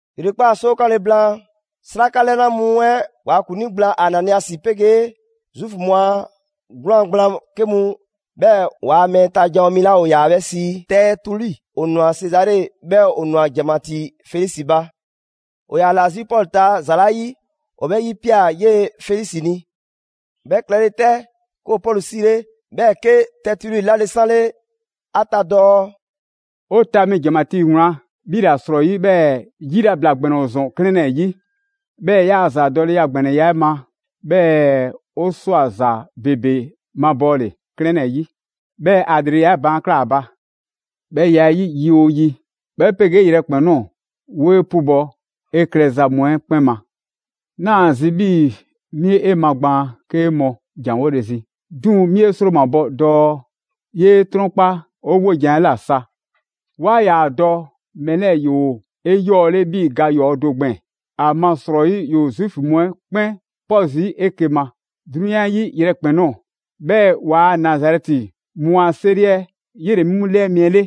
‑Yrekpaa' 'soo 'kanle‑ blaan, 'sraka 'lɛna mu 'ɛ ‑waa' ‑kuŋlii gblaan Ananiasi 'pegee Zuufu mu a 'gwlaan‑ gblaan 'ke mu, 'bhɛɛ‑ waa mɛɛ ta ‑janwo' mi 'la ‑o ‑yaa 'bhɛ sii Tɛɛtuli, ‑o ꞊nwa Sezare. 'Bhɛɛ‑ ‑o ꞊nwa ‑janmatii Felisi ba. ‑O ‑yaa ‑la 'zi Pɔlu ta ‑za 'la 'yi, ‑o 'bhɛ 'yipia꞊ 'yee‑ Felisi ni. 'Bhɛ klɛle 'tɛ, 'ke ‑o Pɔlu 'siile, 'bhɛɛ‑ 'ke Tɛɛtuli 'lale‑ 'sanle ‑a ta dɔɔ: «'O ta mi ‑janmatii wlan, 'bhi ‑la 'srɔyi 'bhɛɛ‑ yilabla ‑gbɛnɛ ‑o ‑zɔn 'klɛɛn 'ɛ 'yi. 'Bhɛɛ‑ 'yaa‑ ‑zadɔleya ‑gbɛnɛya 'ɛ 'ma, 'bhɛɛ‑ ‑o ꞊swa ‑za ‑bebe mabɔɔle 'klɛɛn 'lɛɛ‑ 'yi, 'bhɛɛ‑ ‑a ‑lreleya 'ɛ baan' ꞊klaa ‑a ba. 'Bhɛ ya 'ɛ 'yi, yi 'oo yi 'bhɛ 'pegee yrɛkpɛn‑ ꞊nɔɔ, 'wo 'e 'pubɔ‑ 'e klɛza mu 'ɛ 'kpɛn ma. 'Naa‑ zi 'bhii‑ 'mi 'e magbaan 'ke 'ŋ mɔ ‑janwole zi, 'duŋ‑ 'mi 'e 'sromabɔ dɔɔ 'yee 'trɔnkpa 'o 'wojan‑ 'ɛ ꞊la sa. 'Wa ꞊ya dɔɔ mɛɛ 'lɛɛ‑ ‑yoo 'eyɔɔle 'bhii‑ ga ‑yɔɔ' do gbɛɛn‑. ‑Amasrɔyi ‑yoo Zuufu mu 'ɛ 'kpɛn 'pɔ zii' 'eke‑ ma 'drunyan 'ɛ 'yi yrɛkpɛn‑ ꞊nɔɔ. 'Bhɛɛ‑ ‑waa' Nazarɛti mu a 'seri 'ɛ, 'yele‑ 'mu ‑lɛɛ mi 'ɛ 'le.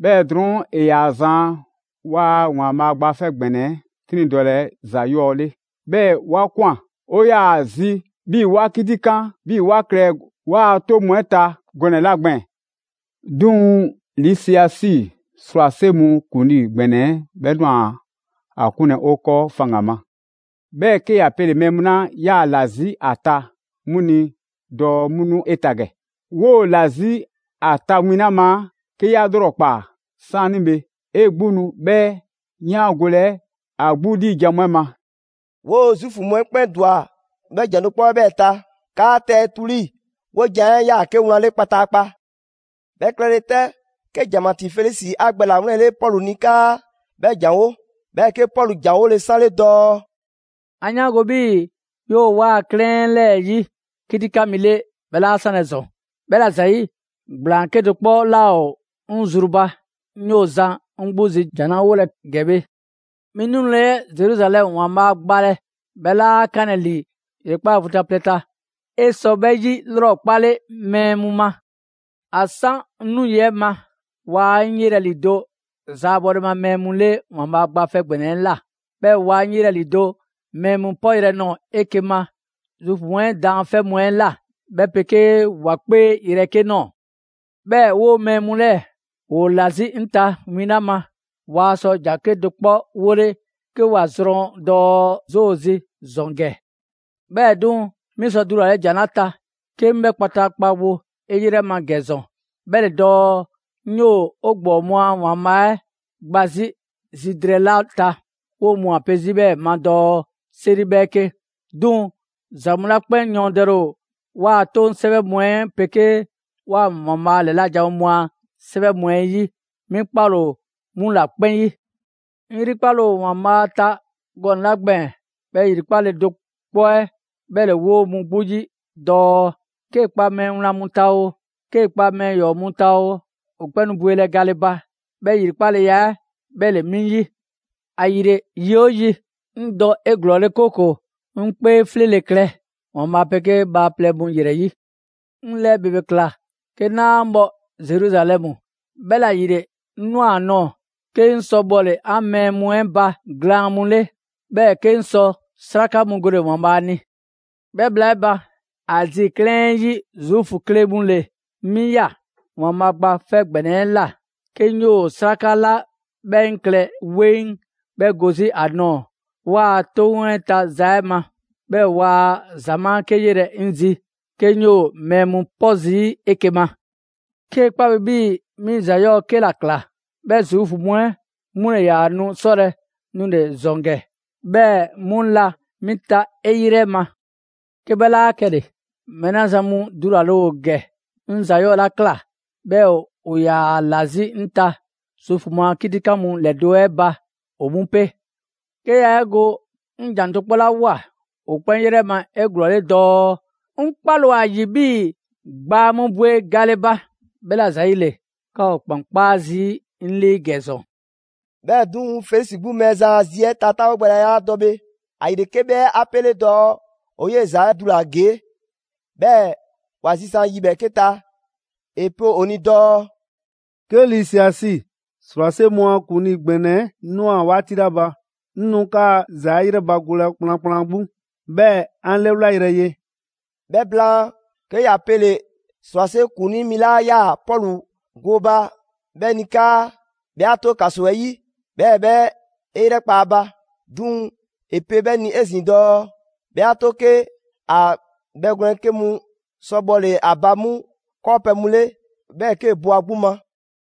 'Bhɛɛ‑ drɔɔn' ‑e ‑yaa zan 'waa‑ ‑Waanbhaa' Gba 'Fɛ ‑Gbɛnɛ 'ɛ 'triŋdɔlɛ ‑za 'yɔɔ‑ 'le, 'bhɛɛ‑ 'wa ꞊kwan. 'O 'yaa‑ zi 'bhii‑ 'wa 'kitikan 'bhii‑ 'wa klɛ 'waa‑ 'toŋ mu 'ɛ ta gɔnɛ‑ 'la gbɛɛn‑. 'Duŋ‑ Lisiasi, ‑srwase' mu ‑kuŋlii ‑gbɛnɛ 'ɛ, 'bhɛ ꞊nwa ‑a 'kunlɛ‑ 'o 'kɔɔ faŋgan‑ ma. 'Bhɛɛ‑ 'ke ‑ya pele‑ mɛɛ mu 'la ꞊yaa ‑la 'zi 'a ta 'mu ni dɔɔ 'mu nu 'e ta ‑gɛ. 'Woo‑ ‑la 'zi ‑a ta win 'la ma, 'ke 'ya 'lrɔkpaa‑ 'saanibhe, 'e 'gbu nu 'bhɛ 'yaangolɛ ‑a 'gbu 'liijan‑ mu 'ɛ ma.» 'Woo‑ Zuufu mu 'ɛ 'kpɛn ‑dwa 'bhɛ ‑jan do 'kpɔ 'ɛ 'bhɛɛ‑ ta, 'kaa Tɛɛtuli 'wojan‑ 'ɛ 'yaa‑ 'ke wlan 'le kpataakpa. 'Bhɛ klɛle 'tɛ, 'ke ‑janmatii Felisi ‑a gbɛ ‑lawlɛnle Pɔlu ni 'kaa 'bhɛ ‑janwo', 'bhɛɛ‑ 'ke Pɔlu ‑janwole 'sanle dɔɔ: «'An 'yaango‑ 'bhii‑ 'yoo‑ 'waa‑ 'klɛɛn 'lɛɛ‑ 'yi 'kitikan mi 'le 'bhɛ 'laa 'sanlɛ‑ ‑zɔn. 'Bhɛla‑ ‑zayi', ‑gblaan 'kedo‑ 'kpɔ 'laa ‑o 'ŋ zru ba, 'ŋ ꞊yoo zan 'ŋ 'gbu zi jan 'la 'wolɛ‑ ‑gɛ bhe. 'Mi 'nule 'ɛ Zeruzalɛmu ‑Waanbhaa' gbalɛ, 'bhɛ 'laa 'kanlɛ‑ ‑li ‑yrekpaa' vu ta plɛ ta. 'E sɔ 'bhɛ 'yilrɔkpale mɛɛ mu ma. ‑A 'san 'ŋ 'nu yi 'ɛ ma, waa 'ŋ 'yelɛ‑ ‑lido' zaabɔle ma mɛɛ mu 'le ‑Waanbhaa' Gba 'Fɛ ‑Gbɛnɛ 'ɛ ꞊la. 'Bhɛɛ‑ waa 'ŋ 'yelɛ‑ ‑lido' mɛɛ mu 'pɔ yrɛ nɔɔ‑ 'eke‑ ma Zuufu mu 'ɛ daanfɛ' mu 'ɛ ꞊la 'bhɛ 'pegee ‑wa 'kpee yrɛ 'ke ꞊nɔɔ. 'Bhɛɛ‑ 'woo‑ mɛɛ mu 'lɛɛ‑, ‑woo ‑la 'zi 'ŋ ta win 'la ma, waa sɔ ‑jan 'kedo‑ 'kpɔ 'wole 'ke ‑wa zrɔn dɔɔ 'zoo ‑o zi ‑zɔn ‑gɛ. 'Bhɛɛ‑ 'duŋ‑, 'mi sɔ dulale ‑jan 'la ta 'ke 'ŋ 'bhɛ kpataakpa wo 'e 'yrɛ ma ‑gɛ ‑zɔn, 'bhɛ ‑le dɔɔ: 'ŋ 'yoo‑ 'o ‑gbɔɔ mu a ‑Waanbhaa' 'ɛ gba 'zi zi drɛɛ 'la ta, 'woo‑ mu ‑o ‑a pe 'zi 'bhɛɛ‑ ma dɔɔ 'seri 'bhɛɛke. 'Duŋ‑ ‑za mu 'la 'kpɛn yɔɔndɛle ‑o 'waa‑ 'toŋ 'sɛwɛ mu 'ɛ 'pegee 'waa‑ ‑Waanbhaa' ‑lɛla' janwo mu a 'sɛwɛ mu 'ɛ 'yi, 'mi 'kpale‑ ‑o 'mu ‑la 'kpɛn 'yi. 'Ŋ 'yrikpale ‑o ‑Waanbhaa' ta gɔnɛ‑ 'la gbɛɛn‑, 'bhɛ 'yrikpale do 'kpɔ 'ɛ 'bhɛ ‑le 'woo‑ mu 'gbu 'yi dɔɔ 'kee‑ 'kpa mɛɛ wlan mu ta oo, 'kee‑ kpa mɛɛ ‑yɔɔ' mu ta oo, ‑o 'kpɛn nu bwelɛ gale ba, 'bhɛ ‑yrikpaleya 'ɛ 'bhɛ ‑le 'mi 'yi. ‑Ayile yi 'oo yi, 'ŋ dɔ 'eglɔɔle 'kooko‑ 'ŋ 'kpee 'fleele‑ klɛ ‑Waanbhaa' 'pegee bhaaplɛŋ mu ‑yrɛ 'yi.» «'Ŋ lɛɛ ‑bebe ꞊kla 'ke 'naa bhɔ Zeruzalɛmu, 'bhɛla‑ ‑yile 'ŋ ꞊nwa ‑a nɔɔ‑, 'ke 'ŋ sɔ bhɔle‑ 'an mɛɛ mu 'ɛ ba ‑glaan' mu 'le, 'bhɛɛ‑ 'ke 'ŋ sɔ 'sraka mu gole‑ ‑Waanbhaa' ni. 'Bhɛɛ‑ bhla 'ɛ ba, Azi 'klɛɛn 'ɛ 'yi Zuufu 'ke mu ‑le 'mi ꞊ya ‑Waanbhaa' Gba 'Fɛ ‑Gbɛnɛ 'ɛ ꞊la 'ke 'ŋ 'yoo 'sraka 'la 'bhɛ 'ŋ klɛ 'weŋ 'bhɛ go 'zi ‑a ꞊nɔɔ 'waa‑ 'toŋ 'ɛ ta za 'ɛ ma. 'Bhɛɛ‑ waa ‑zamaa' 'ke 'yelɛ‑ 'ŋ zi 'ke 'ŋ 'yoo‑ mɛɛ mu 'pɔ zii' 'eke‑ ma. 'Kee‑ 'kpa bi 'bhii‑ 'mi ‑za 'yɔɔ‑ 'ke ‑la꞊kla, 'bhɛ Zuufu mu 'ɛ 'mu ‑le ‑yaa nu 'sɔlɛ‑ nule‑ ‑zɔn ‑gɛ, 'bhɛɛ‑ 'mu la 'mi ta 'e 'yrɛ ma. 'Ke 'bhɛ 'laa 'kɛle‑, mɛɛ 'la zan mu dulale ‑o ‑gɛ, 'ŋ ‑za 'yɔɔ‑ 'la ꞊kla 'bhɛɛ‑ ‑o ‑yaa ‑la 'zi 'ŋ ta Zuufu mu a 'kitikan mu ‑lɛdo' 'ɛ ba, ‑o 'mu 'pe. 'Ke 'yaa 'e go 'ŋ ‑jan do 'kpɔ 'la ꞊woa ‑o 'kpɛn 'yrɛ ma 'eglɔɔle dɔɔ: ‹'Ŋ 'kpale‑ ‑o ‑a ‑yi 'bhii‑ gbaa mu bwe gale ba›. 'Bhɛla‑ ‑zayile, 'ka ‑o ‑kpan 'kpaa zii' 'ŋ 'lii ‑gɛ ‑zɔn!» 'Bhɛɛ‑ 'duŋ‑, Felisi 'gbu Mɛɛzan a zi 'ɛ ta 'taawogbɛya 'la dɔ bhe, ‑ayile 'ke 'bhɛ 'a 'pele dɔɔ ‑o 'yee‑ ‑za 'ɛ dula‑ ‑gee', 'bhɛɛ‑ ‑wa zisan' yi ‑bhɛɛke' ta; ‑e pe ‑o ni dɔɔ: «'Ke Lisiasi, ‑srwase' mu a ‑kuŋlii ‑gbɛnɛ 'ɛ ꞊nwa 'waati 'la ba, 'ŋ nu 'kaa‑ ‑za 'ɛ 'yrɛbagolɛ kplankplan 'gbu, 'bhɛɛ‑ 'an 'lɛwlayrɛ ye.» 'Bhɛ blaan, 'ke ‑ya pele‑ ‑srwase' ‑kuŋlii mi 'la ꞊yaa Pɔlu gooba 'bhɛ ni 'kaa 'bhɛ 'a 'to ‑kaso 'ɛ 'yi, 'bhɛɛ‑ 'bhɛ 'e 'yrɛkpa 'a ba. 'Duŋ‑ ‑e pe 'bhɛ ni 'ezin‑ dɔɔ 'bhɛ 'a 'to 'ke ‑a bhɛgwlɛn 'ke mu sɔ bhɔle‑ ‑a ba 'mu 'kɔɔpɛ‑ mu 'le, 'bhɛɛ‑ 'kee‑ bo ‑a 'gbu ma.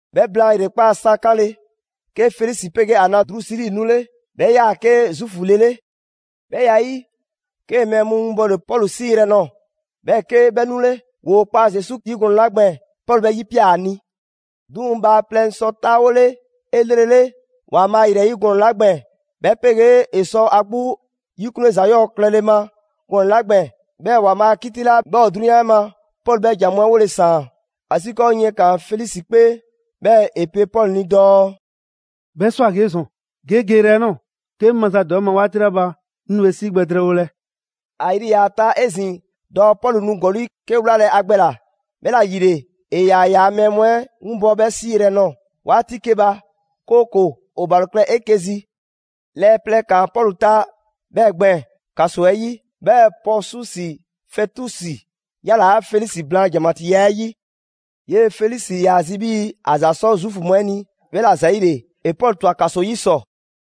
'Bhɛ blaan ‑yrekpaa' sa 'kanle‑, 'ke Felisi 'pegee ‑a na Drusili 'nule. 'Bhɛ ꞊yaa 'ke Zuufu le 'le. 'Bhɛ ya 'ɛ 'yi, 'kee‑ mɛɛ mu winbɔle Pɔlu 'sii yrɛ nɔɔ‑, 'bhɛɛ‑ 'ke 'bhɛ 'nule. ‑Woo kpa Zesu Krisi 'yi gɔnɛ‑ 'la gbɛɛn‑, Pɔlu 'bhɛ 'yipia꞊ ‑a ni. 'Duŋ‑ ‑bhaaplɛŋ sɔ 'taawole 'elrele ‑Waanbhaa' ‑yrɛyi' gɔnɛ‑ 'la gbɛɛn‑, 'bhɛ 'pegee ‑e sɔ ‑a 'gbu 'yikunle ‑za 'yɔɔ‑ klɛle ma gɔnɛ‑ 'la gbɛɛn‑, 'bhɛɛ‑ ‑Waanbhaa' a 'kiti 'la 'bhɛ ‑o 'drunyan 'ɛ ma, Pɔlu 'bhɛɛ‑ ‑jan mu 'ɛ 'wole‑ ‑saan. ‑Asiikɔɔ yiɛn ꞊kaan Felisi 'kpee, 'bhɛɛ‑ ‑e pe Pɔlu ni dɔɔ: «'Bhɛ ꞊swa ‑gee' ‑zɔn, ge 'e geyrɛ 'ɛ ꞊nɔɔ, 'ke 'ŋ mazadwa 'e ma 'waati 'la ba, 'ŋ nu 'e 'sii gbɛ drɛɛwolɛ.» ‑A yri ‑yaa ‑a ta 'ezin‑ dɔɔ Pɔlu nu ‑gɔli' 'ke 'wlalɛ‑ ‑a gbɛ ꞊la; 'bhɛla‑ ‑yile ‑e ‑yaa ‑yaa' mɛɛ mu 'ɛ winbɔ 'bhɛ 'sii yrɛ nɔɔ‑ 'waati 'ke ba, 'kooko‑ ‑o ‑balo klɛ 'eke‑ zi. Lɛɛ plɛ ‑kaan Pɔlu ta 'bhɛɛ‑ gbɛɛn‑ ‑kaso 'ɛ 'yi. 'Bhɛɛ‑ Pɔɔsusi Fɛtusi ‑yalaa' Felisi blaan ‑janmatiiya 'ɛ 'yi. 'Yee‑ Felisi ‑yaa zi 'bhii‑ ‑a ‑za 'sɔ Zuufu mu 'ɛ ni, 'bhɛla‑ ‑zayile ‑e Pɔlu ‑twa ‑kaso 'yi ‑sɔ.